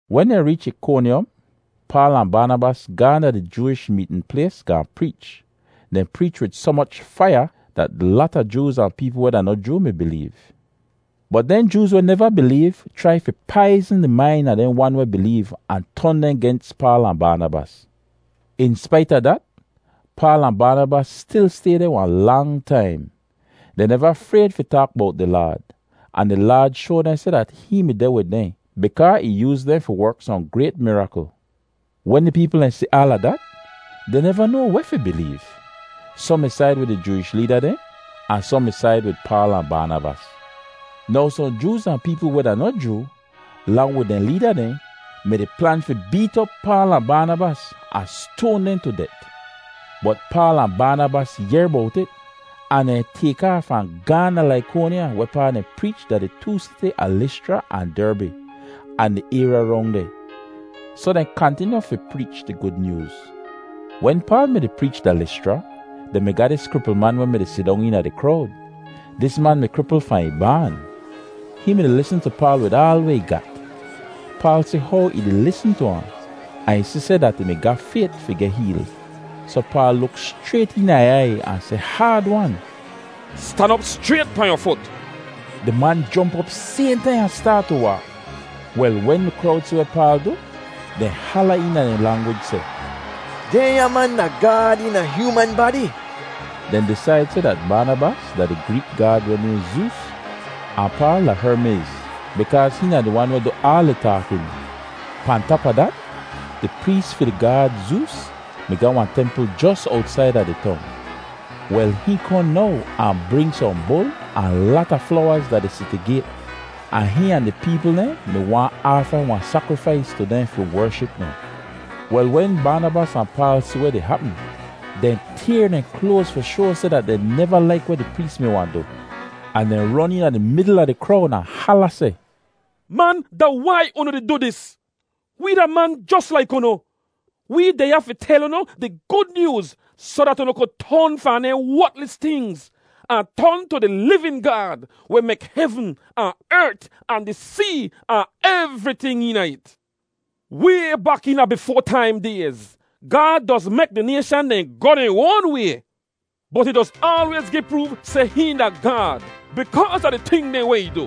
Wen dehn reech Ikonyom, Paal ahn Baanabas gaahn da di Jooish meetn plays gaahn preech. Dehn preech wid soh moch faiya dat lata Jooz ahn peepl weh da noh Joo mi bileev. Bot dehn Jooz weh neva bileev chrai fi paizn di main a dehn wan weh bileev ahn ton dehn gens Paal ahn Baanabas. In spait a dat, Paal ahn Baanabas stil stay deh wahn lang taim. Dehn neva frayd fi taak bowt di Laad, ahn di Laad shoa dehn seh dat hihn mi deh wid dehn bikaa ih yooz dehn fi werk sohn grayt mirakl. Wen di peepl dehn si aala dat, dehn neva noa weh fi bileev. Sohn mi said wid di Jooish leeda dehn, ahn sohn mi said wid Paal ahn Baanabas. Now sohn Jooz ahn peepl weh da noh Joo, lang wid dehn leeda dehn, mi-di plan fi beet op Paal ahn Baanabas ahn stoan dehn tu det. Bot Paal ahn Baanabas yehr bowt it, ahn dehn tayk aaf ahn gaahn da Laikonya wehpaa dehn preech da di too siti a Lischra ahn Derbi, ahn di ayrya rong deh. Soh dehn kantinyu fi preech di Gud Nyooz. Wen Paal mi-di preech da Lischra, dehn mi ga dis kripl man weh mi-di sidong eena di krowd. Dis man mi kripl fahn ih baan. Hihn mi-di lisn tu Paal wid aal weh ih gat. Paal si how ih di lisn tu ahn, ahn ih si seh dat ih ga fayt fi geh heel, soh Paal luk schrayt eena ih aiy ahn seh haad-wan, “Stan op schrayt pahn yu fut.” Di man jomp op sayhn taim ahn staat tu waak. Wel, wen di krowd si weh Paal du, dehn hala eena dehn langwij seh, “Dehnya man da Gaad eena hyooman badi.” Dehn disaid seh dat Baanabas da di Greek gaad weh nayhn Zoos, ahn Paal da Hermiz bikaaz hihn da di wan weh du aal di taakin. Pahn tap a dat, di prees fi di gaad Zoos mi ga wahn templ jos owtsaida di tong. Wel, hihn kohn now ahn bring sohn bul ahn lata flowaz da di siti gayt, ahn hihn ahn di peepl dehn mi waahn aafa wahn sakrifais tu dehn fi wership dehn. Wel, wen Baanabas ahn Paal si weh di hapm, dehn tayr dehn kloaz fi shoa seh dat dehn neva laik weh di prees mi wahn du, ahn dehn ron eena di midl a di krowd ahn hala seh, “Man, da wai unu di du dis? Wee da man jos laik unu! Wee deh ya fi tel unu di Gud Nyooz soh dat unu ku ton fahn dehnya wotlis tingz ahn ton tu di livin Gaad weh mek hevn, ahn ert, ahn di see, ahn evriting eena it. Way bak eena bifoa taim dayz, Gaad doz mek di nayshan dehn goh dehn oan way. Bot ih doz aalwayz gi proof seh hihn da Gaad bikaaz a di ting dehn weh ih du.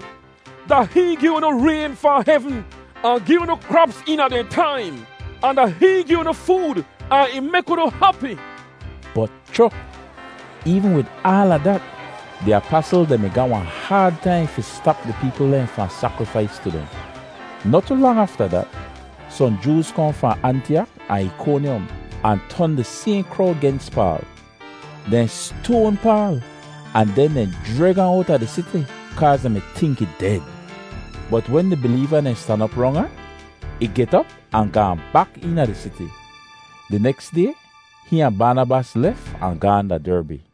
Da hihn gi unu rayn fahn hevn, ahn gi unu kraps eena dehn taim; ahn da hihn gi unu food ahn ih mek unu hapi.” Bot, cho! Eevn wid aala dat, di apasl dehn mi ga wahn haad taim fi stap di peepl dehn fahn sakrifais tu dehn. Noh tu lang afta dat, sohn Jooz kohn fahn Antiyak ahn Ikonyom ahn ton di sayhn krowd gens Paal. Dehn stoan Paal ahn den dehn jreg ahn owta di siti kaaz dehn mi tink ih ded. Bot wen di bileeva dehn stan op rong ahn, ih get op ahn gaahn bak eena di siti. Di neks day hihn ahn Baanabas lef ahn gaahn da Derbi.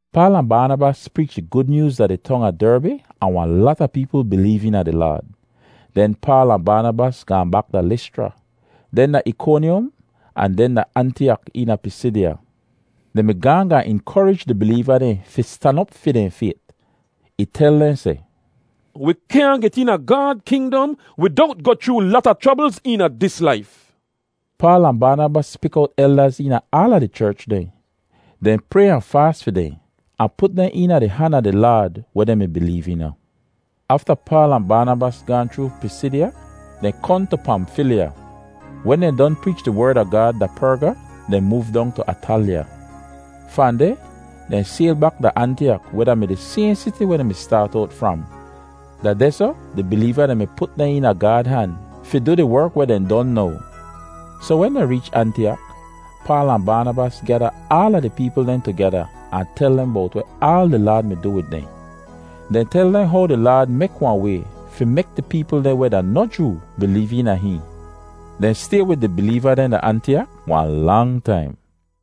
Paal ahn Baanabas preech di Gud Nyooz da di tong a Derbi ahn wahn lata peepl bileev eena di Laad. Den Paal ahn Baanabas gaahn bak da Lischra, den da Ikonyom ahn den da Antiyak eena Pisidya. Dehn mi gaahn gaahn inkorij di bileeva dehn fi stan op fi dehn fayt. Ih tel dehn seh, “Wi kyaahn get eena Gaad kingdom widowt goh chroo lata chroblz eena dis laif.” Paal ahn Baanabas pik owt eldaz eena aala di cherch dehn. Dehn pray ahn faas fi dehn ahn put dehn eena di han a di Laad weh dehn mi bileev eena. Afta Paal ahn Baanabas gaahn chroo Pisidya, dehn kohn tu Pamfilya. Wen dehn don preech di Werd a Gaad da Perga, dehn moov dong tu Atalya. Fahn deh dehn sayl bak da Antiyak weh da-mi di sayhn siti weh dehn mi staat owt fram. Da dehsoh di bileeva dehn mi put dehn eena Gaad han fi du di werk weh dehn don now. Soh wen dehn reech Antiyak, Paal ahn Baanabas gyada aala di peepl dehn tugeda ahn tel dehn bowt weh aal di Laad du wid dehn. Dehn tel dehn how di Laad mek wahn way fi mek di peepl dehn weh da noh Joo bileev eena hihn. Dehn stay wid di bileeva dehn da Antiyak wahn lang taim.